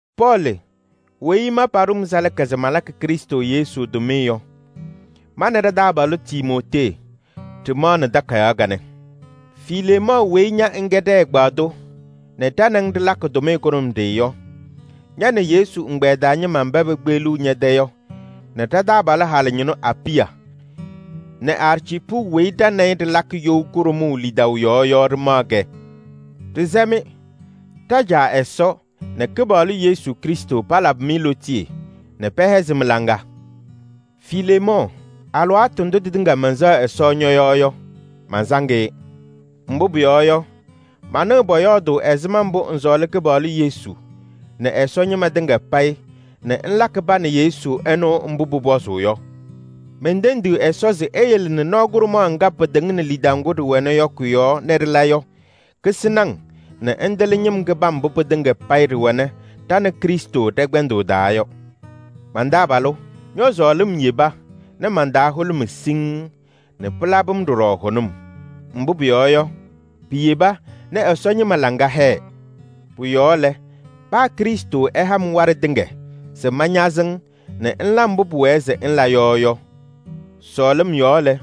Pɔɔlɩ weyi ma paɖʋ-m salaka se malakɩ Krɩstʋ Yesu tʋmɩyɛ yɔ, ma nɛ ɖa-taabalʋ Timootee ɖɩmaɣnɩ takayaɣ kanɛ. Fileemɔɔ weyi ña ŋkɛ ɖɛ-ɛgbaadʋ nɛ ɖa nɛ ŋ ɖɩlakɩ tʋmɩyɛ kʋɖʋmɖɩyɛ yɔ, ña nɛ Yesu ɛgbɛyɛ taa ñɩma mba pekpeɣliɣ ñɛ-tɛ yɔ nɛ ɖa-taabalʋ halʋ ñɩnʋ Apɩya nɛ Arciipu weyi ɖa nɛ ɩ ɖɩlakɩ you kʋɖʋmʋʋ lidaʋ yɔɔ yɔ ɖɩmaɣ-kɛ, ɖɩsɛ-mɩ: ɖa-Caa Ɛsɔ nɛ Kɩpaɣlʋ Yesu Krɩstʋ palabɩ-mɩ lootiye nɛ pɛhɛzɩ mɩ-laŋa. Fileemɔɔ, alɩwaatʋ ndʋ tɩtɩŋa mɛnsɛɣ Ɛsɔ ñɔ-yɔɔ yɔ, mansaŋ-ɩ. Mbʋ pʋyɔɔ yɔ, manɩɣ pɔyɔɔdʋʋ ɛzɩma mbʋ ŋsɔɔlɩ Kɩpaɣlʋ Yesu nɛ Ɛsɔ ñɩma tɩŋa payɩ nɛ ŋlakɩ pa nɛ Yesu ɛnʋ mbʋ pʋpɔzʋʋ yɔ. Mentendiɣ Ɛsɔ se eyele nɛ nɔɔ kʋɖʋmaɣ ŋga pɩtɩŋnɩ lidaʋ ŋgʋ ɖɩwɛnɩ yɔ kʋ-yɔɔ nɛ ɖɩla yɔ, kasɩnɩ-ŋ nɛ ŋtɩlɩ ñɩm kɩbam mbʋ pɩtɩŋa payɩ ɖɩwɛnɩ ɖa nɛ Krɩstʋ ɖɛ-kpɛndʋʋ taa yɔ. Man-taabalʋ, ñɔ-sɔɔlɩm yeba nɛ man-taa hʋlʋmɩ siŋŋ nɛ pɩlabɩ-m ɖɔɖɔ hʋnʋm. Mbʋ pʋyɔɔ yɔ, piyeba nɛ Ɛsɔ ñɩma laŋa hɛɛ. Pʋ-yɔɔ lɛ, paa Krɩstʋ ɛha-m waɖɛ tɩŋa se mañazɩ-ŋ nɛ ŋla mbʋ pʋwɛɛ se ŋla yɔ yɔ, sɔɔlɩm yɔɔ lɛ,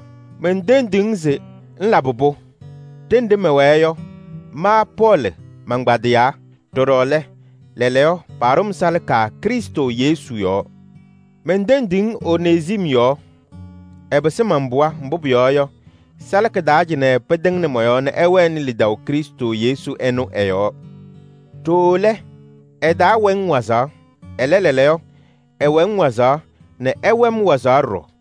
mentendiɣ-ŋ se ŋlabɩ-pʋ. Ɖenɖe mɛwɛɛ yɔ, ma Pɔɔlɩ mankpadɩyaa. Ɖɔɖɔ lɛ, lɛɛlɛɛyɔ paɖʋ-m salaka Krɩstʋ Yesu yɔɔ. Mentendiɣ-ŋ Onezim yɔɔ. Ɛpɩsɩ man-pɩɣa, mbʋ pʋyɔɔ yɔ, salaka taa cɩnɛ pɩtɩŋnɩ mɔ-yɔɔ nɛ ɛwɛnɩ lidaʋ Krɩstʋ Yesu ɛnʋ ɛ-yɔɔ. Ɖooo lɛ, ɛtaawɛ-ŋ wazaɣ. Ɛlɛ, lɛɛlɛɛyɔ ɛwɛ-ŋ wazaɣ nɛ ɛwɛ-m wazaɣ ɖɔɖɔ.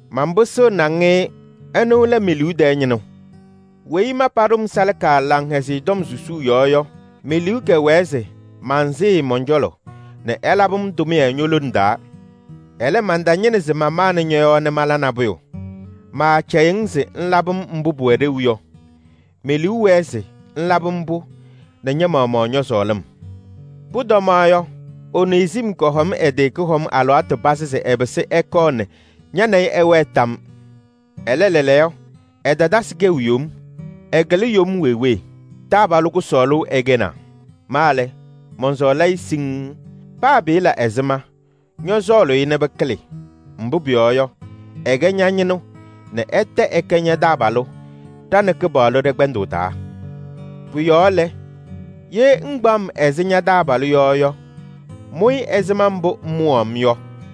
Manpɩsɩɣnɩ-ŋ-ɩ, ɛnʋ lɛ me-liu tɛɛ ñɩnʋ. Weyi ma paɖʋ-m salaka Laŋhɛzɩyɛ Tɔm susuu yɔɔ yɔ, me-liu kɛwɛɛ se mansɩɩ-ɩ mɔn-cɔlɔ nɛ ɛlabɩ-m tʋmɩyɛ ño-lone taa. Ɛlɛ, mantañɩnɩ se mamanɩ ñɔ-yɔɔ nɛ mala nabʋyʋ: maacɛyɩɣ-ŋ se ŋlabɩ-m mbʋ pʋwɛ ɖeu yɔ. Me-liu wɛɛ se ŋlabɩ-m-pʋ nɛ ña-maɣmaɣ ñɔ-sɔɔlɩm. Pʋtɔma yɔ, Onezim kɔhɔm ɛ-tɩ kʋhɔm alɩwaatʋ pazɩ se ɛpɩsɩ ɛkɔɔ nɛ ña nɛ ɩ ɩwɛɛ tam yɔɔ. Ɛlɛ lɛɛlɛɛyɔ, ɛtatasɩ kɛʋ yom. Ɛkɩlɩ yom wee wee. Taabalʋ kʋsɔɔlʋ ɛkɛnaa. Ma lɛ, mɔnsɔɔlɩ-ɩ siŋŋ. Paa pɩɩla ɛzɩma, ñɔsɔɔlʋʋ-ɩ nɛ pɩkɩlɩ. Mbʋ pʋyɔɔ yɔ, ɛkɛ ña-ñɩnʋ nɛ ɛtɛ ɛkɛ ña-taabalʋ ɖa nɛ Kɩpaɣlʋ ɖɛ-kpɛndʋʋ taa. Pʋ-yɔɔ lɛ, ye ŋkpaɣ-m ɛzɩ ña-taabalʋ yɔ yɔ, mʋ-ɩ ɛzɩma mbʋ ŋmʋwaɣ-m yɔ.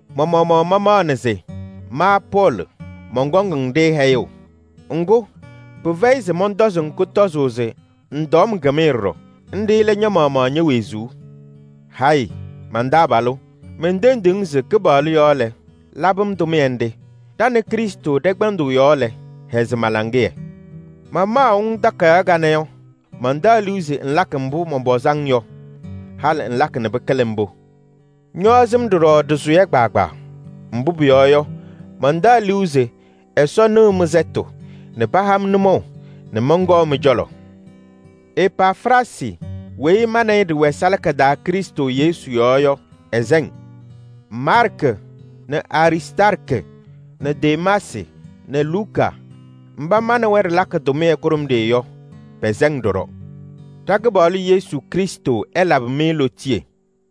Ma-maɣmaɣ mamaɣnɩ se: ma Pɔɔlɩ mɔnkɔŋ-ŋ-ɖɩ hɛyʋʋ. Ŋgʋ, pɩfɛyɩ se mɔntɔzɩ-ŋ kʋtɔzʋʋ se ŋtɔɔ-m kɩmɩyɛ ɖɔɖɔ. Nɖɩ lɛ ña-maɣmaɣ ñe-wezuu. Hayɩ! Man-taabalʋ, mentendiɣ-ŋ se Kɩpaɣlʋ yɔɔ lɛ, labɩ-m tʋmɩyɛ nɖɩ. Ɖa nɛ Krɩstʋ ɖɛ-kpɛndʋʋ yɔɔ lɛ, hɛzɩ ma-laŋɩyɛ. Mamaɣʋ-ŋ takayaɣ kanɛ yɔ, mantaɣ liu se ŋlakɩ mbʋ mɔnpɔzɩ-ŋ yɔ. Halɩ ŋlakɩ nɛ pɩkɩlɩ mbʋ. Ñɔɔzɩ-m ɖɔɖɔ ɖɩsʋyɛ kpaagbaa. Mbʋ pʋyɔɔ yɔ, mantaɣ liu se Ɛsɔ nɩɣ mɩ-sɛtʋ nɛ paha-m nʋmɔʋ nɛ mɔnkɔɔ mɩ-cɔlɔ. Epafraasɩ weyi ma nɛ ɩ ɖɩwɛ salaka taa Krɩstʋ Yesu yɔɔ yɔ, ɛsɛ-ŋ. Maarkɩ nɛ Aristaarkɩ nɛ Demaasɩ nɛ Luka mba ma nɛ wɛ ɖɩlakɩ tʋmɩyɛ kʋɖʋmɖɩyɛ yɔ, pɛsɛ-ŋ ɖɔɖɔ. Ɖa-Kɩpaɣlʋ Yesu Krɩstʋ ɛlabɩ-mɩ lootiye.